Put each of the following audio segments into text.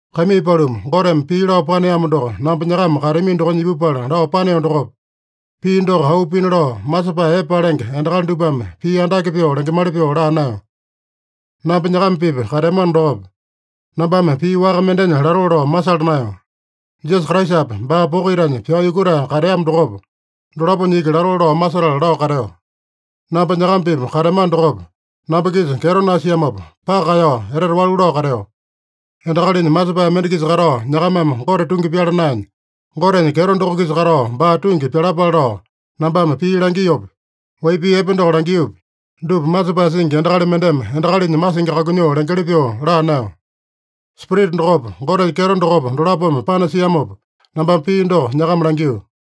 Kaimii paluma, Goteme pii lao paneamo doko namba nyakama kateamino dokonya ipupala lao paneo dokopa, pii doko auu pina lao, masepae epe palenge endakali dupame pii andake pyoo lengemali pyoo laa naeyo. Namba nyakama-pipa kateamano dokopa, nambame pii waka mendenya latoo lao masala naeyo. Jisasa Kraisapa, baa poko itanya pyao yukutae kateamo dokopa, dolaponya iki latoo lao masetala lao kateo. Namba nyakama-pipa kateamano dokopa, namba-kisa kyeto nasiamopa, paka kaeyao etete walu lao kateo. Endakalinya masepae mende-kisa katao nyakamame Gote tungi pyala naenya, Gotenya kyeto doko-kisa katao baa tungi pyalapale lao nambame pii langiopi, wai pii epe doko langiopi, dupa masepae singi endakali mendeme endakalinya masingi kakunyoo lengeli pyoo laa naeyo. Spirita dokopa, Gotenya kyeto dokopa, dolapome panasiamopa, nambame pii doko nyakama langio.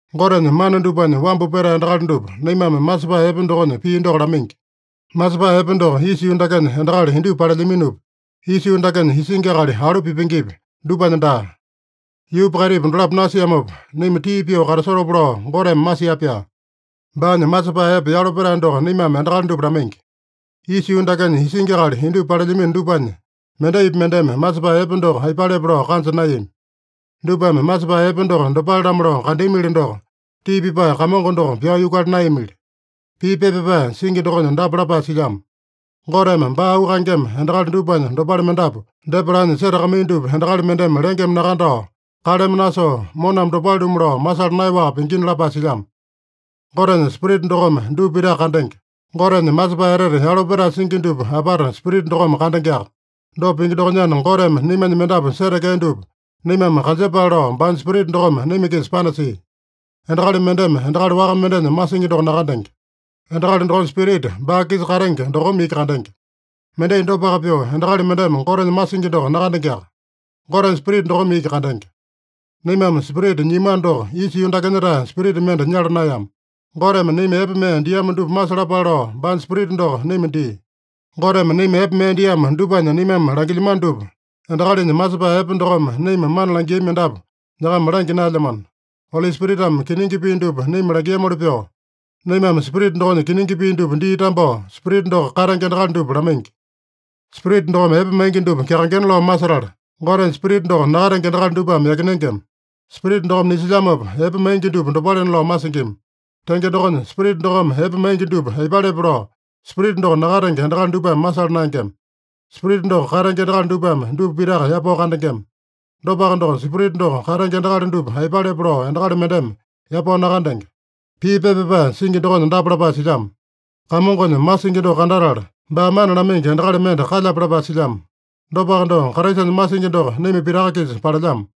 Gotenya mana dupanya wambu petae endakali dupa naimame masepae epe dokonya pii doko lamaingi. Masepae epe doko isa yuu dakenya endakali indupa palelyaminopi, isa yuu dakenya isingi akali alu pipengepi, dupanya daa. Yuupa kaitipa dolapo nasiamopa, naima tii pyoo katasotopa lao Goteme masia-pyaa. Baanya masepae epe yalo petae doko naimame endakali dupa lamaingi. Isa yuu dakenya isingi akali indupa palelyamino dupanya mendaipi mendeme masepae epe doko aipalepe lao kanja naeyami. Dupame masepae epe doko dopale-lamo lao kandeamili doko, tii pipae Kamongo doko pyao yukuala naeyamili. Pii pepa pyapae singi dokonya dapa lapae silyamo: “Goteme baa auu kaengema endakali dupanya dopale mendapu depa lanya setakamaiya dupa endakali mendeme lengeme nakandao, kaleme nasoo, moname dopale-lumu lao masala naeyaowaka pingina” lapae silyamo. Gotenya Spirita dokome dupa pitaka kandenge. Gotenya masepae etete yalo petae singi dupa apata Spirita dokome kandengeaka. Dopa pingi dokonyana, Goteme naimanya mendapu setekea dupa naimame kanjepale lao baanya Spirita dokome naima-kisa panasia. Endakali mendeme endakali waka mendenya masingi doko nakandenge. Endakali dokonya spirita, baa-kisa katenge dokome iki kandenge. Mendai dopaka pyoo, endakali mendeme Gotenya masingi doko nakandengeaka. Gotenya Spirita dokome iki kandenge. Naimame Spirita nyiamano doko, isa yuu dakenya-tae spirita mende nyala naeyama. Goteme naima epe mee diamo dupa masalapale lao baanya Spirita doko naima dia. Goteme naima epe mee diamo dupanya naimame langilyamano dupa, endakalinya masepae epe dokome naima mana langiami mendapu nyakama langya naelyamano. Oli Spiritame kiningi pii dupa naima langiamoli pyoo, naimame Spirita dokonya kiningi pii dupa dii tambao, Spirita doko katenge endakali dupa lamaingi. Spirita dokome epe maingi dupa kyakaengena lao masetala, Gotenya Spirita doko nakatenge endakali dupame yakinengema. Spirita dokome nisilyamopa, epe maingi dupa dopalena lao masingima. Tenge dokonya, Spirita dokome epe maingi dupa aipalepe lao Spirita doko nakatenge endakali dupame masala naengema. Spirita doko katenge endakali dupame dupa pitaka yapao kandengema. Dopaka doko, Spirita doko katenge endakali dupa aipalepe lao endakali mendeme yapao nakandenge. Pii pepa pyapae singi dokonya dapa lapae silyamo: “Kamongonya masingi doko kandatala, baa mana lamaingi endakali mende kalyape?” lapae silyamo. Dopaka doko, Kraisanya masingi doko naima pitaka-kisa palelyamo.